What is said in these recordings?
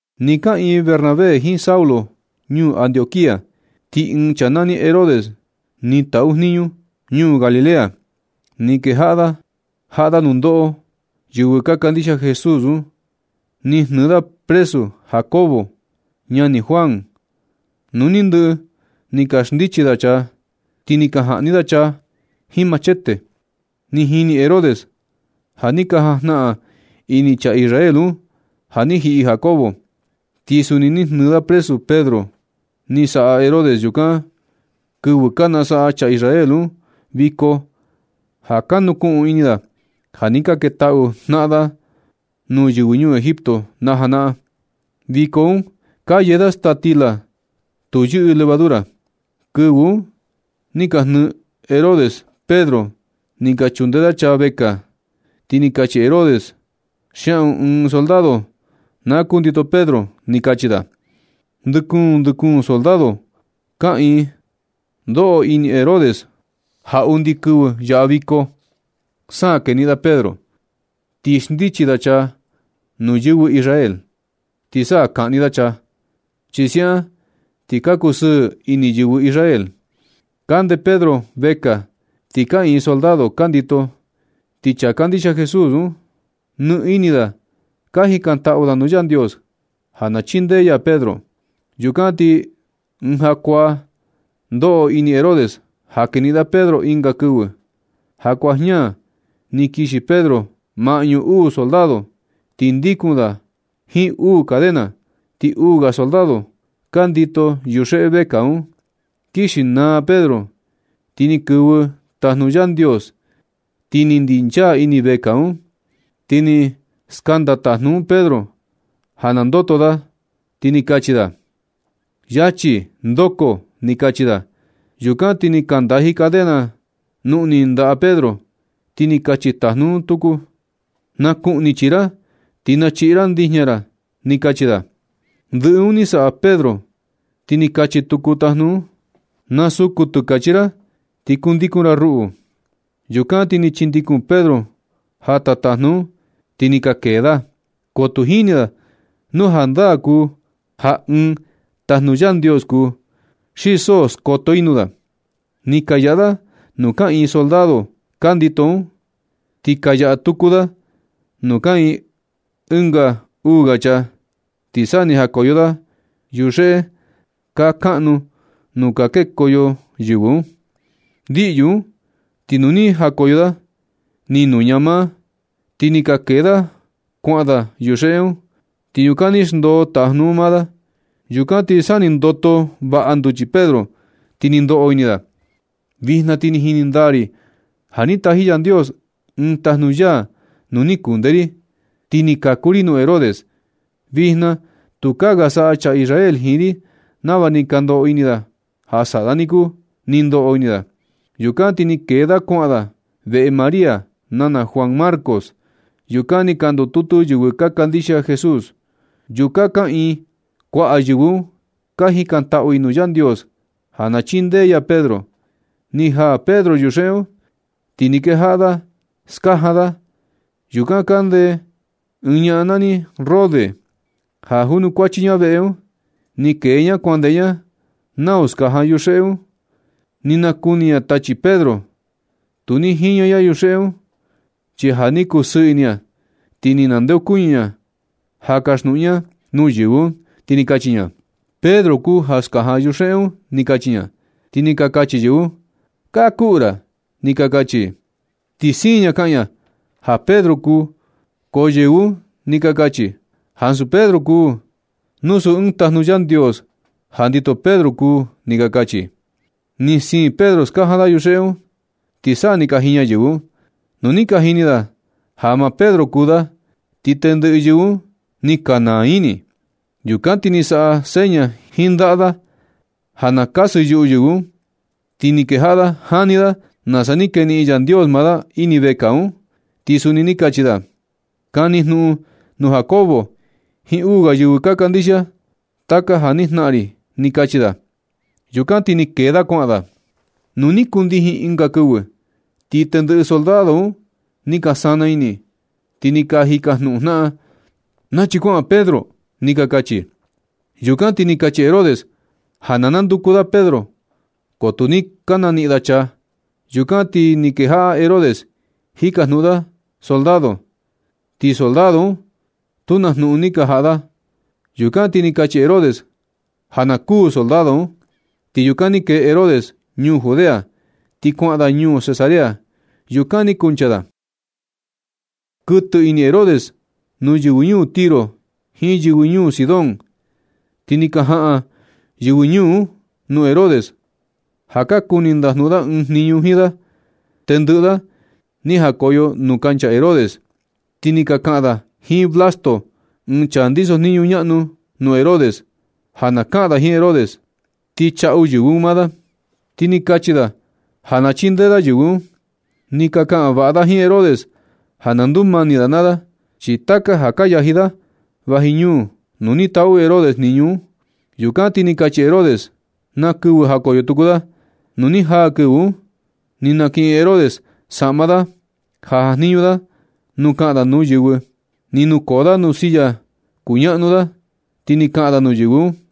Nɨ kaꞌiin Bernabé jiin Saulo ñuu Antioquía, ti ɨɨn chaa nani Herodes, ni taꞌu jniñu ñuu Galilea. Ni kejaꞌa da jaꞌa da nundoꞌo yɨvɨ ka kandixia Jesús un. Ni jnɨɨ da presu Jacobo, ñani Juan. Nu ni ndɨꞌɨ ni ka xndichi da chaa, ti ni ka jaꞌni da chaa jiin machete. Ni jini Herodes ja ni ka jajnaꞌan ini chaa Israel un ja ni jiꞌi Jacobo. Ti suni ni jnɨɨ da presu Pedro. Ni saꞌa Herodes yukan kɨvɨ ka nasaꞌa chaa Israel, un viko ja ka nukuꞌun ini da ja ni ka ketaꞌu jnaꞌan da nuu yɨvɨ ñuu Egipto najanaꞌan. Viko un ka yee da staa stila tu yɨꞌɨ levadura. Kɨvɨ un ni ka jnɨɨ Herodes Pedro ni ka chundee da chaa vekaa. Ti ni kachi Herodes: ―Xiaꞌun ɨɨn soldado na kundito Pedro ―ni kachi da. Ndɨ kuun, ndɨ kuun soldado kaꞌiin. Ndoꞌo ini Herodes ja undi kɨvɨ yaꞌa viko un sa keniꞌin da Pedro, ti xndichi da chaa nuu yɨvɨ Israel, ti sa kaꞌni da chaa, chi siaꞌan ti ka kusɨɨ ini yɨvɨ Israel. Kande Pedro vekaa ti kaꞌiin soldado ka ndito, ti chaa ka kandixia Jesús un, nɨ ini da ka jikantaꞌu da nuu Yandios ja na chindee ya Pedro. Yukan ti ɨɨn jakuaa ndoꞌo ini Herodes ja keniꞌin da Pedro ɨnga kɨvɨ. Jakuaa jña ni kixi Pedro maꞌñu uu soldado, ti ndikun da jiin uu cadena. Ti uu ga soldado ka ndito yuxeꞌe vekaa un. Kixi naa Pedro, ti ni kɨvɨ ɨɨn tajnu Yandios, ti ni ndinchaa ini vekaa un. Ti ni skanda tajnu un Pedro ja na ndoto da, ti ni kachi da: ―Yachi ndoko ―ni kachi da. Yukan ti ni ka ndaji cadena nuꞌni ndaꞌa Pedro. Ti ni kachi tajnu un tuku: ―Na kuꞌni chii ra ti na chiꞌi ra ndijña ra ―ni kachi da. Ndɨꞌɨ un ni saꞌa Pedro ti ni kachi tuku tajnu un: ―Na suku tɨkachi ra ti kundikun ra ruꞌu. Yukan ti ni chindikun Pedro jata tajnu un ti ni ka kee da, ko tu jini da nu jandaa kuu ja ɨɨn tajnu Yandios kuu, xi so skoto i nuu da. Ni ka yaꞌa da nuu kaꞌiin soldado ka ndito un, ti ka yaꞌa tuku da nuu kaꞌiin ɨnga uu ga chaa, ti sa ni jakoyo da yuxeꞌe kaa kaꞌnu nuu ka kekoyo yɨvɨ un. Ndiꞌyu un, ti nu ni jakoyo da, ni nuña maa, ti ni ka kee da kuaꞌan da yuxeꞌe un. Ti yukan ni xndoo tajnu un maa da. Yukan ti sa ni ndoto vaꞌa nduchi Pedro, ti ni ndoꞌo ini da: ―Vijna ti ni jini ndaa ri ja ni taji Yandios ɨɨn tajnu ya nuu ni kunde ri, ti ni kaku ri nuu Herodes. Vijna tukaa ga saꞌa chaa Israel jiin ri nava ni ka ndoꞌo ini da ja saꞌa da niku ―ni ndoꞌo ini da. Yukan ti ni kee da kuaꞌan da veꞌe María, nana Juan Marcos. Yukan ni ka ndututu yɨvɨ ka kandixia Jesús. Yukan kaꞌiin kuaꞌa yɨvɨ un ka jikantaꞌu i nuu Yandios ja na chindee ya Pedro. Ni jaa Pedro yuxeꞌe un, ti ni kejaꞌa da skajan da. Yukan kande ɨɨn ñaꞌan nani Rode, ja junukuachi veꞌe un. Ni kee ña kuandeꞌe ña nau skajan yuxeꞌe un. Ni nakuni ña tachi Pedro. Tu ni jiña ña yuxeꞌe un, chi ja ni kusɨɨ ini ña, ti ni nandeokuñɨ ña ja na kasjnuꞌun ña nuu yɨvɨ un, ti ni kachi ña: ―Pedro kuu ja skajan yuxeꞌe un ―ni kachi ña. Ti ni ka kachi yɨvɨ un: ―Kakuꞌu ra ―ni ka kachi i. Ni siin ña kaꞌan ña ja Pedro kuu, ko yɨvɨ un ni ka kachi: ―Ansu Pedro kuu. Nu suu ɨɨn tajnu Yandios ja ndito Pedro kuu ―ni ka kachi. Ni siin Pedro skajan da yuxeꞌe un, ti sa ni ka jiña yɨvɨ un. Nu ni ka jini ja maa Pedro kuu da, ti tendɨꞌɨ yɨvɨ un ni ka naa ini. Yukan ti ni saꞌa da seña jiin ndaꞌa da ja na kasɨ yuꞌu yɨvɨ un. Ti ni kejaꞌa da jani da nasa ni keniꞌin Yandios maa da ini vekaa un, ti suni ni kachi da: ―Kani jnuꞌun nuu Jacobo jiin uu ga yɨvɨ ka kandixia, taka ja ni jnaꞌan ri ―ni kachi da. Yukan ti ni kee da kuaꞌan da. Nu ni kundijin ɨnga kɨvɨ, ti tendɨꞌɨ soldado un ni ka sana ini, ti ka jikajnuꞌun jnaꞌan: ―Nachi kuaꞌan Pedro ―ni ka kachi. Yukan ti ni kachi Herodes ja na nanduku da Pedro, ko tu ni ka naniꞌin da chaa. Yukan ti ni kejaꞌa Herodes jikajnuꞌun da soldado, ti soldado un tu na jnuꞌun ni ka jaꞌa da. Yukan ti ni kachi Herodes ja na kuū soldado un. Ti yukan ni kee Herodes ñuu Judea ti kuaꞌan da ñuu Cesarea. Yukan ni kuncha da. Kɨtɨ ini Herodes nuu yɨvɨ ñuu Tiro jiin yɨvɨ ñuu Sidón. Ti ni ka jaꞌan yɨvɨ ñuu un nuu Herodes ja ka kuni ndajnuꞌun ɨɨn jniñu jiin da. Tendɨꞌɨ da ni jakoyo nuu kancha Herodes, ti ni ka kaꞌan da jiin Blasto, ɨɨn chaa ndisojniñu ñaꞌnu nuu Herodes, ja na kaꞌan da jiin Herodes, ti chaꞌu yɨvɨ un maa da. Ti ni kachi da ja chindee da yɨvɨ un. Ni ka kaꞌan vaꞌa da jiin Herodes ja na ndumani da naa da, chi taka ja ka yaji da vaji ñuu nuu ni taꞌu Herodes jniñu un. Yukan ti ni kachi Herodes na kɨvɨ jakoyo tuku da. Nu ni jaa kɨvɨ un, ni nakiꞌin Herodes saꞌma da ja jajniñu da nu kaꞌan da nuu yɨvɨ. Ni nukoo da nuu silla kuñaꞌnu da, ti ni kaꞌan da nuu yɨvɨ un.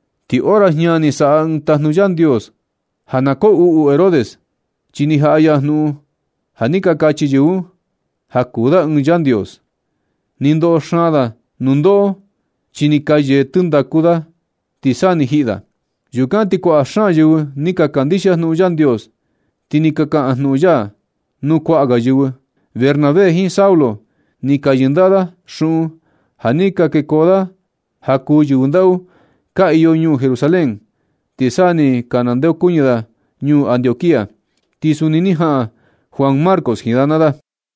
Ti hora jña ni saꞌa ɨɨn tajnu Yandios ja na koo uꞌu Herodes, chi ni jaꞌa ya jnuꞌun ja ni ka kachi yɨvɨ un ja kuu da ɨɨn yandios. Ni ndoꞌo xaan da nundoꞌo, chi ni ka yee tɨndaku da, ti sa ni jiꞌi da. Yukan ti kuaꞌa xaan yɨvɨ ni ka kandixia jnuꞌun Yandios, ti ni ka kaꞌan jnuꞌun ya nuu kuaꞌa ga yɨvɨ. Bernabé jiin Saulo ni ka yɨndaꞌa da xuꞌun ja ni ka kekoo da ja kuu yɨvɨ ndaꞌu ka iyo ñuu Jerusalén, ti sa ni ka nandeokuñɨ da ñuu Antioquía. Ti suni ni jaꞌan Juan Marcos jiin da naa da.